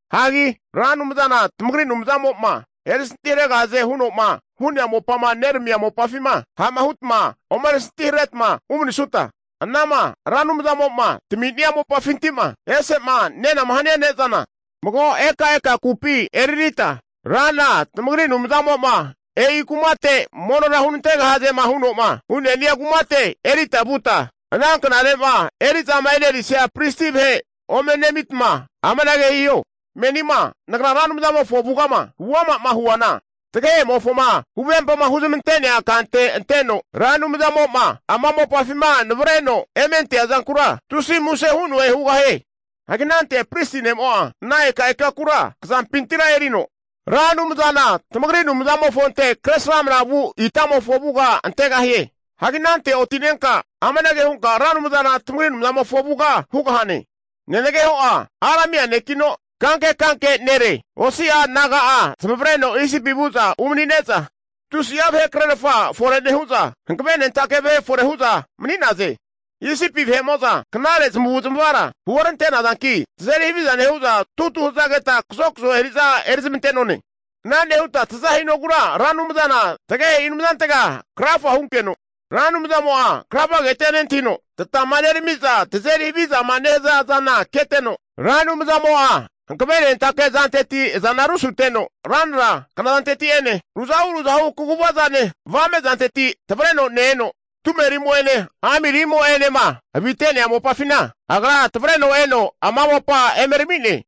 Hagi Ra Anumzana tamagri Anumzamo'ma erisanti haregahaze huno'ma hu'nea mopama neramia mopafima, ha'ma hutma omeri santiharetama umanisuta, anama Ra Anumzamo'ma tami'nia mopafinti'ma ese'ma nenama hania ne'zana, mago ekaeka kupi eraritma, Rana tamagri Anumzamo'ma e'i kumate monora hunantegahazema huno'ma hu'ne'nia kumate erita vuta, ana knare'ma eri'zama e'nerisia pristi vahe ome nemitma amanage hiho, menima nagra Ra Anumzamofo avugama huama'ma huana, tagehe'mofoma huvempama huzmante'nea kante anteno, Ra Anumzamo'ma ama mopafima navareno emenantea zankura tusi muse hu'noe hugahie. Hagi anante pristi ne'mo'a, ana ekaeka kura tamazampintira erino, Ra Anumzana tamagri Anumzamofonte kresramna vu itamofo avuga antegahie. Hagi anante oti'nenka amanage hunka Ra Anumzana tamagri Anumzamofo avuga hugahane, nenageho'a Aramia nekino kanke kanke nere, osi'a naga'a zamavareno Isipi vu'za umani'ne'za, tusi'a vahekrerfa fore nehu'za, hanavenentake vahe fore hu'za mani'naze. Isipi vahe'mo'za knare zamavu'zamavara huorante'nazanki, tazeri haviza nehu'za tutu hazageta kazokzo eri'za erizmante'none. Ana nehuta taza hinogura Ra Anumzana tagehe'i Anumzantega krafa hunkeno, Ra Anumzamo'a krafagetia nentahino, tata huzama nerami'za tazeri havizama nehaza zana keteno, Ra Anumzamo'a hankavenentake azanteti, azana rusuteno ranra knazanteti'ene ruzahu ruzahu kaguvazane avamezanteti tavreno ne-eno, tumerine amirimo'enema avi'mate'nea mopafina, Agra tavreno eno ana mopa emerami'ne.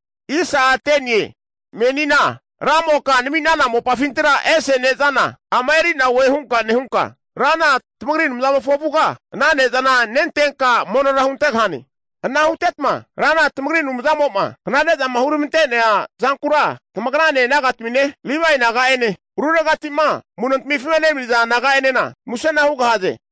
Menina Ramoka nami'nana mopafintira ese ne'zana ama eri'na oe hunka nehunka, Rana tamagri Anumzamofo avuga ana ne'zana nentenka monora huntegahane. Ana hutetma Rana tamagri Anumzamo'ma knare'zama huramante'nea zankura tamagrane nagatamine, Livae naga'ene, ruregati'ma amu'notamifima enemaniza naga'enena musena hugahaze.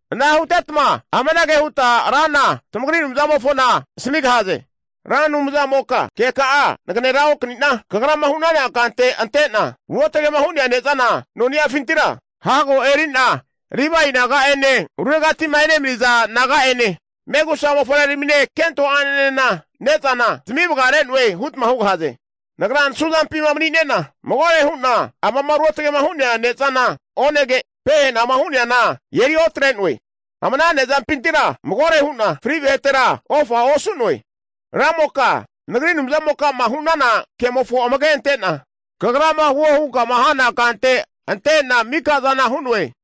Ana hutetma amanage huta Rana tamagri Anumzamofona asamigahaze, Ra Anumzamoka keka'a naganera okani'na, Kagrama hu'nana kante ante'na ruotge'ma hu'nea ne'zana noniafintira hago eri'na Livae naga'ene, ruregati'ma enemaniza naga'ene, megusa mofavreramine, kento a'nenena ne'zana zamivagare'noe hutma hugahaze. Nagra nasuzampima mani'ne'na magore hu'na amama ruotge'ma hu'nea ne'zana onege, pehenama hu'neana eriotre'noe. Ama ana ne'zampintira magore hu'na fri vahetera ofa osu'noe. Ramoka nagri Anumzamokama hu'nana kemofo amage'a ante'na, kagrama huo hunkama hana kante ante'na mika'zana hu'noe.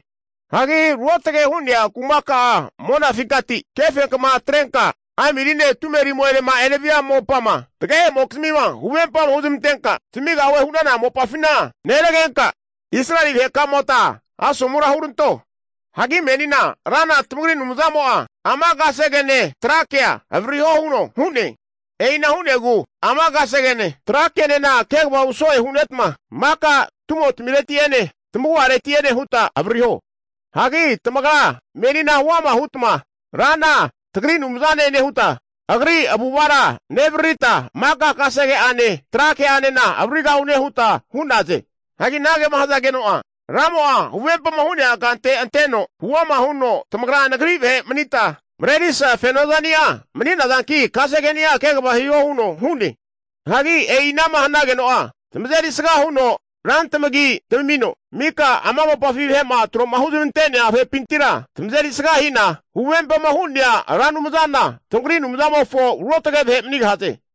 Hagi ruotge hu'nea kumaka'a monafinkati, kefenkama atrenka amirine tumerimo'enema enevia mopama tagehe'mokizmima huvempa huzmantenka zamigahue hu'nana mopafina neragenka, Israeli vahekamota asomura huranto. Hagi menina Rana tamagri Anumzamo'a ama kasegene tra kea avaririho huno hu'ne. E'ina hu'negu ama kasegene, tra kenena kegava huso'e hu'netma, maka tumotamireti'ene tamagu'areti'ene huta avaririho. Hagi tamagra menina huama hutma Rana tagri Anumzane nehuta, Agri avu'avara nevaririta maka kasege'ane trake'anena avaririgahune huta hu'naze. Hagi anagema hazageno'a, Ramo'a huvempama hu'nea kante anteno, huama huno tamagra Nagri vahe manita, marerisa fenozani'a mani'nazanki kasegeni'a kegava hiho huno hu'ne. Hagi e'i anama hanageno'a, tamazeri sga huno rantamagi tamamino mika ama mopafi vahe'ma tro'ma huzmante'nea vahepintira tamazeri sga hina, huvempama hu'nea Ra Anumzana tamagri Anumzamofo ruotge vahe manigahaze.